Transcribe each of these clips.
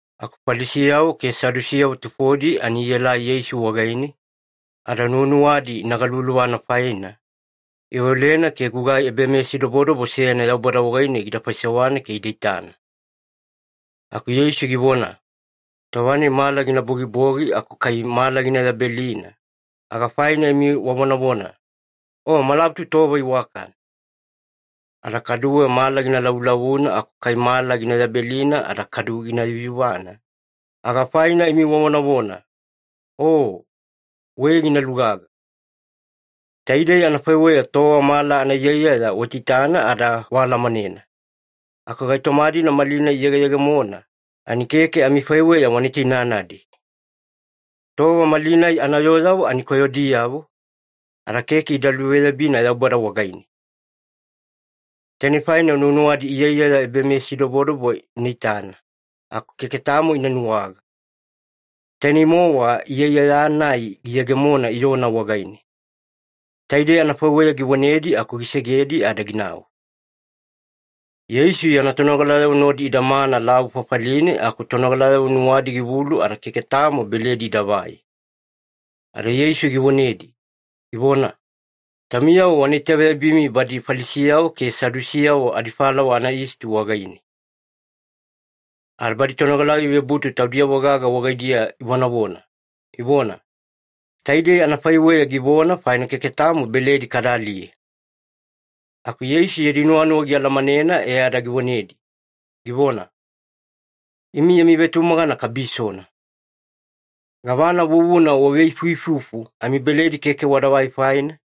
Aku Falisiyavo ke Sadusiyavo tufodi ani ielai Yeisu wagaine, ada nuwanuwadi ina galuvaluvana faina, iveolena ke gugai ebameyasidobodobo seyana Yaubada wagaine gida faisewana ke ida itana. Aku Yeisu givona, “Tova-nai mala gina bogibogi aku kai mala gina yabelina, aga faina imi wavonavona, ‘O, malabutu tova iwakana.’ Ada kaduwe mala gina lavulavuna aku kai mala gina yabelina ada kadu gina yuyuvana, aga faina imi wavonavona, ‘O, wei gina lugaga.’ Taidei anafaiweya tova mala anaiyaiyaya waitaitana ada waalamanena, aku gaitoma-dina malinai iyegeyegemona, ani keke amifaiweya wana itainanadi. Tova malinai anayooyavo ani koyodiyavo, ada keke ida luveyabina Yaubada wagaine. Tainei faina nuwanuwadi iyaiyaya ebameyasidobodobo ina itana, aku keke tamo ina nuwaga, tainei-mowa iyaiyaya-nai giyegemona Iyona wagaine.” Taidei anafaiweya givonedi aku gisegedi ada ginau. Yeisu yana tonogalayavo nodi idamana lavu fafaline aku tonogalayavo nuwadi givulu ada keke tamo beledi idavai. Ada Yeisu givonedi, givona, “Taumiyavo wana itaveyabimi badi Falisiyavo ke Sadusiyavo adifalawa anayisti wagaine.” Ada badi tonogalayavo ivebutu taudiyavo-gaga wagaidiya ivonavona, ivona, “Taidei anafaiweya givona faina keke tamo beledi kada aliye.” Aku Yeisu yadi nuwanuwa gialamanena e ada givonedi, givona, “Imi yami vetumagana kabisona. Gavana vuvuna waveifuifufu amibeledi keke wadavai faina?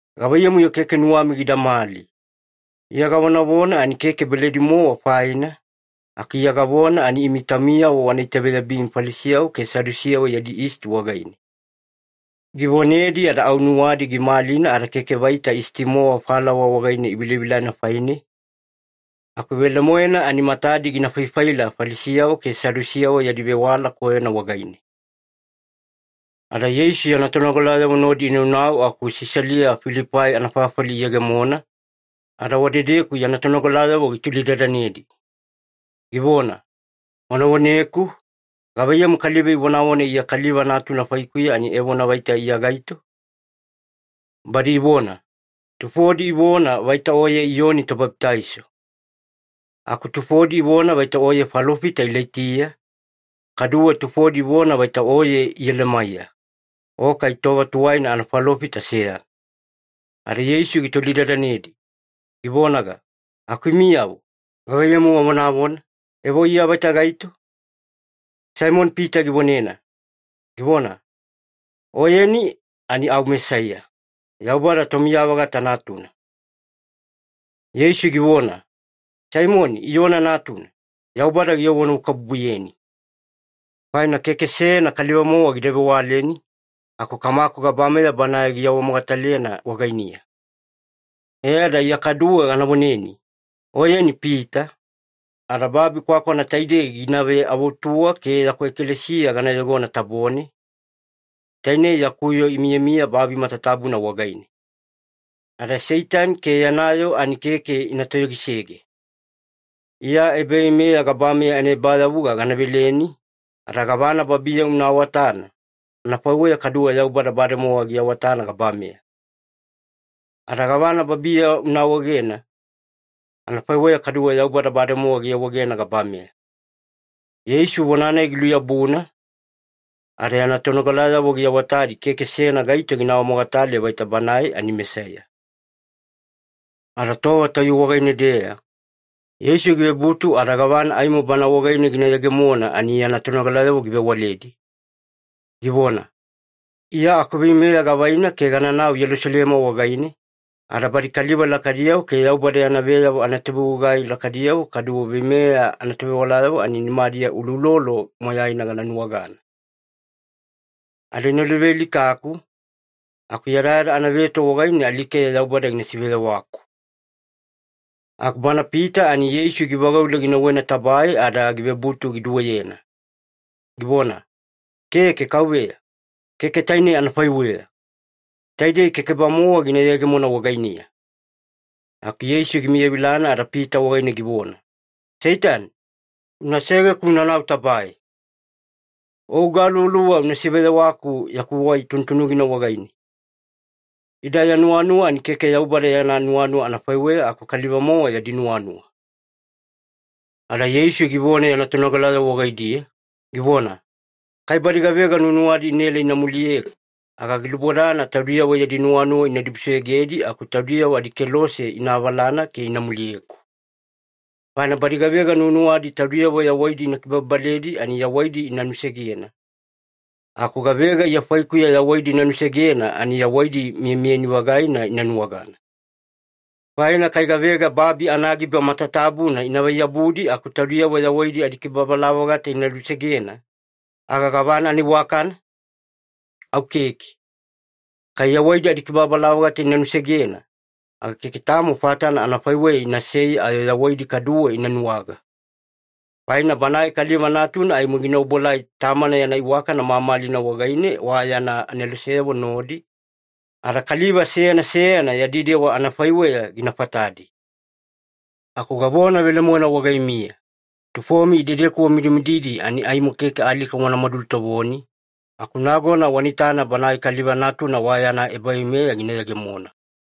Gavaiyamu-yo keke nuwami gidamali? Iya gavonavona ani keke beledi-mowa faina, aku Iya gavona ani imi taumiyavo wana itaveyabimi Falisiyavo ke Sadusiyavo yadi yisti wagaine.” Givonedi ada au nuwadi gimalina ada keke vaita yisti-mowa falawa wagaine ivilavilana faine, aku velemoena ani matadi gina faifaila Falisiyavo ke Sadusiyavo yadi vewala koyona wagaine. Ada Yeisu yana tonogalayavo nodi inaunau aku Sisalia-Filipai anafafali iyegemona, ada wadedeku yana tonogalayavo gitolidadanedi, givona, “Wana voneku, gavaiyamu kaliva ivonavona Iya Kaliva Natuna faikuya ani evona vaita Iya gaito?” Badi ivona, “Tufodi ivona vaita Oye Iyoni Tobabitaiso. Aku tufodi ivona vaita Oye falofita Ilaitiya, kaduwe tufodi ivona vaita Oye Iyelemaiya, o kai tova tuwaina anafalofita seyana.” Ada Yeisu gitolidadanedi, givonaga, “Aku imiyavo, gavaiyamu wavonavona, evo Iya vaita gaito?” Saimoni-Pita givonena, givona, “Oyeni ani au Mesaiya, Yaubada Tomiya-vagata Natuna.” Yeisu givona, “Saimoni Iyona natuna, Yaubada giawanuwakabubuyeni. Faina keke seyana kaliva-mowa gida vewaleni, aku Kamaku gabameya Banae giawamogatalena wagainiya. E ada Iya kaduwe gana voneni, oyeni Pita, ada babi kwakwana taidei gina veavutuwa ke yaku ekalesiya gana yogona tabone, tainei yaku yoo imiyamiya babi matatabuna wagaine. Ada Seitani ke yana yoo ani keke ina toyogisege. Iya ebaveimeya gabameya anaebayavuga gana veleni, ada gavana babiya una awatana, anafaiweya kaduwe Yaubada bademowa giawatana gabameya. Ada gavana babiya una awaegena, anafaiweya kaduwe Yaubada bademowa giawaegena gabameya.” Yeisu vona-nai giluyabuna, ada yana tonogalayavo giawatadi keke seyana gaito gina awamogatale vaita Banae ani Mesaiya. Ada tova tayuwe wagaine-deya, Yeisu givebutu ada gavana aimo Bana wagaine gina yegemona ani yana tonogalayavo givewaledi, givona, “Iya akuveimeya gavaina ke gananau Yelusalema wagaine, ada badi kaliva lakaidiyavo ke Yaubada yana veyavo anatovegugai lakaidiyavo kaduwe veimeya anatovewalayavo ani nimadiya uloulolo moyaina gana nuwagana. Ada ina luvealikaku, aku yadayada anaveto wagaine alikeya Yaubada gina siveyawaku.” Aku bana Pita ani Yeisu givagaule ginauwena tabae ada givebutu giduweyena, givona, “Keke Kauveya, keke tainei anafaiweya! Taidei keke-bamowa gina yegemona wagainiya.” Aku Yeisu gimiyavilana ada Pita wagaine givona, “Seitani, una segeku unanau tabae! O ugaluvaluva una siveyewaku yaku wai tunutunugina wagaine. Ida ya nuwanuwa ani keke Yaubada yana nuwanuwa anafaiweya, aku kaliva-mowa yadi nuwanuwa.” Ada Yeisu givona yana tonogalayavo wagaidiya, givona, “Kai badi gavega nuwanuwadi inaela ina muliyeku, aga gilubodana taudiyavo yadi nuwanuwa ina dibusoyogedi aku taudiyavo adikelose ina avalana ke ina muliyeku. Faina badi gavega nuwanuwadi taudiyavo yawaidi ina kibababaledi ani yawaidi ina nusegena. Aku gavega Iya faikuya yawaidi ina nusegena ani yawaidi miyamiyani-vagaina ina nuwagana. Faina kai gavega babi anagiba matatabuna inavai-yabudi aku taudiyavo yawaidi adikibababala-vagata ida nusegena, aga gavana anaiwakana? Au keke. Kai yawaidi adikibababala-vagata ina nusegena, aga keke tamo fatana anafaiweya inasei ayo yawaidi kaduwe ina nuwaga. Faina Banae Kaliva Natuna aimo gina obuelai Tamana yana iwakana mamalina wagaine wa yana aneloseyavo nodi, ada kaliva seyana seyana yadi dewa anafaiweya gina fatadi. Aku gavona velemoena wagaimiya, tufomi idedeku wamidimididi ani aimo keke alika wanamadu lutovoni, aku nagona wana itana Banae Kaliva Natuna wa yana ebaveimeya gina yegemona.”